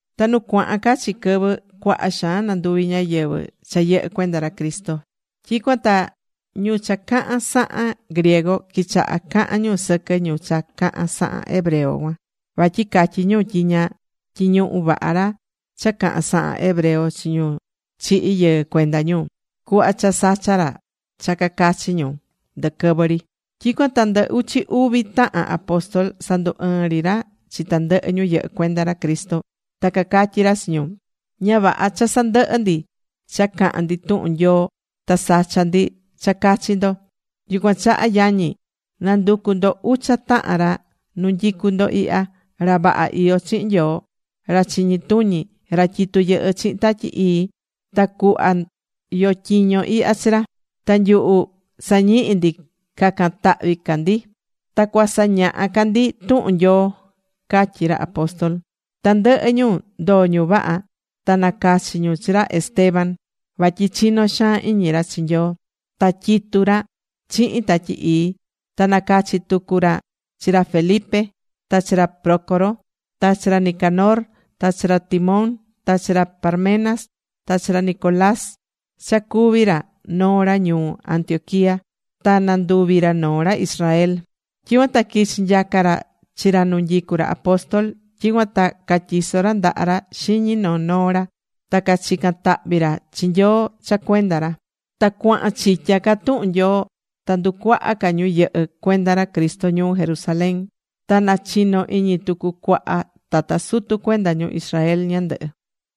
Ta nu cuaha̱n ca chi quɨvɨ cuaha xaan nanduví ñáyɨvɨ cha yɨhɨ́ cuenda ra Cristo. Tyicuan ta ñu cha cahán sahan griego quichaha̱ cahan ñu sɨquɨ ñu cha cahán sahan hebreo cuan. Vatyi catyí ñu tyi ña tyiñuhú vaha ra cha cahán sahan hebreo chi ñu chihi̱ yɨɨ cuenda ñu, cuhva cha sachá ra cha cacachi ñu ndɨquɨvɨ ri. Tyicuan ta ndɨ uchi uvi tahan apóstol sandu ɨɨn ri ra chi tandɨhɨ ñu yɨhɨ́ cuenda ra Cristo. Ta cacatyí ra chi ñu: ―Ña vaha cha sandɨhɨ ndi cha cahan ndi tuhun Nyoo ta sacha ndi cha cachi ndo. Yucuan chaha yañi, na̱nducu ndo ucha tahan ra nu canyicú ndo ihya, ra vaha iyó chihin Nyoo, ra chiñi tuñi, ra tyitú yɨhɨ́ chihin Tatyi Ii. Ta cuhva yo tyiño ihya chi ra. Ta nyuhu sañihi ndi cacan tahvi ca ndi. Ta cuasañaha ca ndi tuhun Nyoo ―catyí ra apóstol. Tandɨhɨ ñu ndoó ñu vaha. Ta nacachi̱ ñu chi ra Esteban. Vatyi chinó xaan iñi ra chi Nyoo. Ta tyitu ra chihin Tatyi Ii. Ta nacachi̱ tucu ra chi ra Felipe, ta chi ra Prócoro, ta chi ra Nicanor, ta chi ra Timón, ta chi ra Parmenas, ta chi ra Nicolás cha cuví ra noo ra ñuu Antioquía, ta nanduvi̱ ra noo ra Israel. Tyicuan ta quichi̱ nyaca ra chi ra nu nyicu ra apóstol. Tyicuan ta catyiso̱ ra ndaha ra xiñi noo noo ra ta cachica̱n tahvi ra chi Nyoo cha cuenda ra. Ta cuaha̱n chitya ca tuhun Nyoo. Ta nducuaha̱ ca ñu yɨhɨ́ cuenda ra Cristo ñuu Jerusalén. Ta na chino̱ iñi tucu cuaha tata sutu cuenda ñu Israel ñandɨhɨ.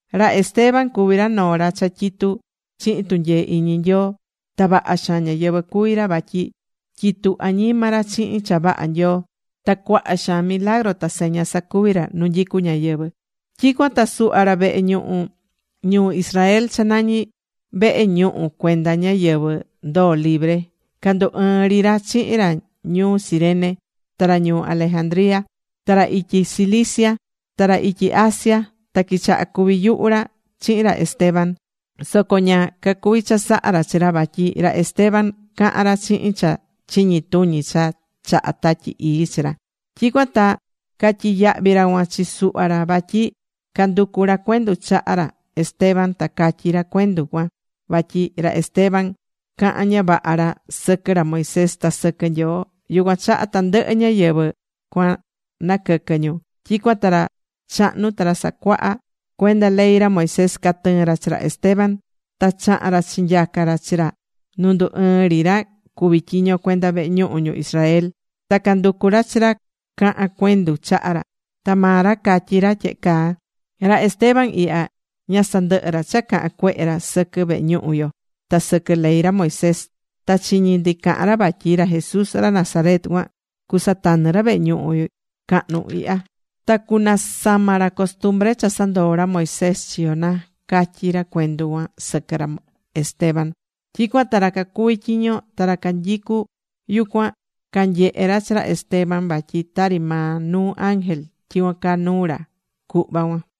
Ra Esteban cuví ra noo ra cha tyitú chihin tunyee iñi Nyoo. Ta vaha xaan ñáyɨvɨ cuví ra vatyi tyitu añima ra chihin cha vaha Nyoo. Ta cuaha xaan milagru ta seña sacuví ra nu nyicú ñáyɨvɨ. Tyicuan ta suhva ra vehe ñuhu ñuu Israel cha nañi Vehe Ñuhu Cuenda Ñáyɨvɨ Ndoo Libre, candu ɨɨn ri ra chihin ra ñuu Cirene, ta ra ñuu Alejandría, ta ra ityi Cilicia, ta ra ityi Asia. Ta quichaha̱ cuvi yuhu ra chihin ra Esteban. Soco ña cacuvi chasaha ra chi ra, vatyi ra Esteban cahán ra chihin cha chiñi tuñi cha chaha Tatyi Ii chi ra. Tyicuan ta catyiyahvi̱ ra cuan chi suhva ra vatyi canducu ra cuendu chaha ra Esteban ta catyi ra cuendu cuan vatyi ra Esteban cahán ña vaha ra sɨquɨ ra Moisés, ta sɨquɨ Nyoo. Yucuan chaha tandɨhɨ ñáyɨvɨ cuan naquɨquɨ̱ ñu. Tyicuan ta ra chahnu ta ra sacuaha cuenda ley ra Moisés, catɨɨ̱n ra chi ra Esteban. Ta chaha̱n ra chinyaca ra chi ra nu ndu ɨɨn ri ra cuví tyiño cuenda vehe ñuhu ñu Israel. Ta canducu̱ ra chi ra cahan cuendu chaha ra. Ta maa ra catyí ra tyehe caa: ―Ra Esteban ihya, ña sandɨhɨ́ ra cha cahan cuehe ra sɨquɨ vehe ñuhu yo ta sɨquɨ ley ra Moisés. Ta chiñi̱ ndi caha̱n ra vatyi ra Jesús ra Nazaret cuan cusatanɨ ra vehe ñuhu cahnu ihya. Ta cunasama ra costumbre cha sandoo̱ ra Moisés chi yo na ―catyí ra cuendu cuan sɨquɨ ra Esteban. Tyicuan ta ra cacuví tyiño ta ra canyicú yucuan canyehe̱ ra chi ra Esteban vatyi tari maa nuu ángel tyicuan caa nuu ra cuhva cuan.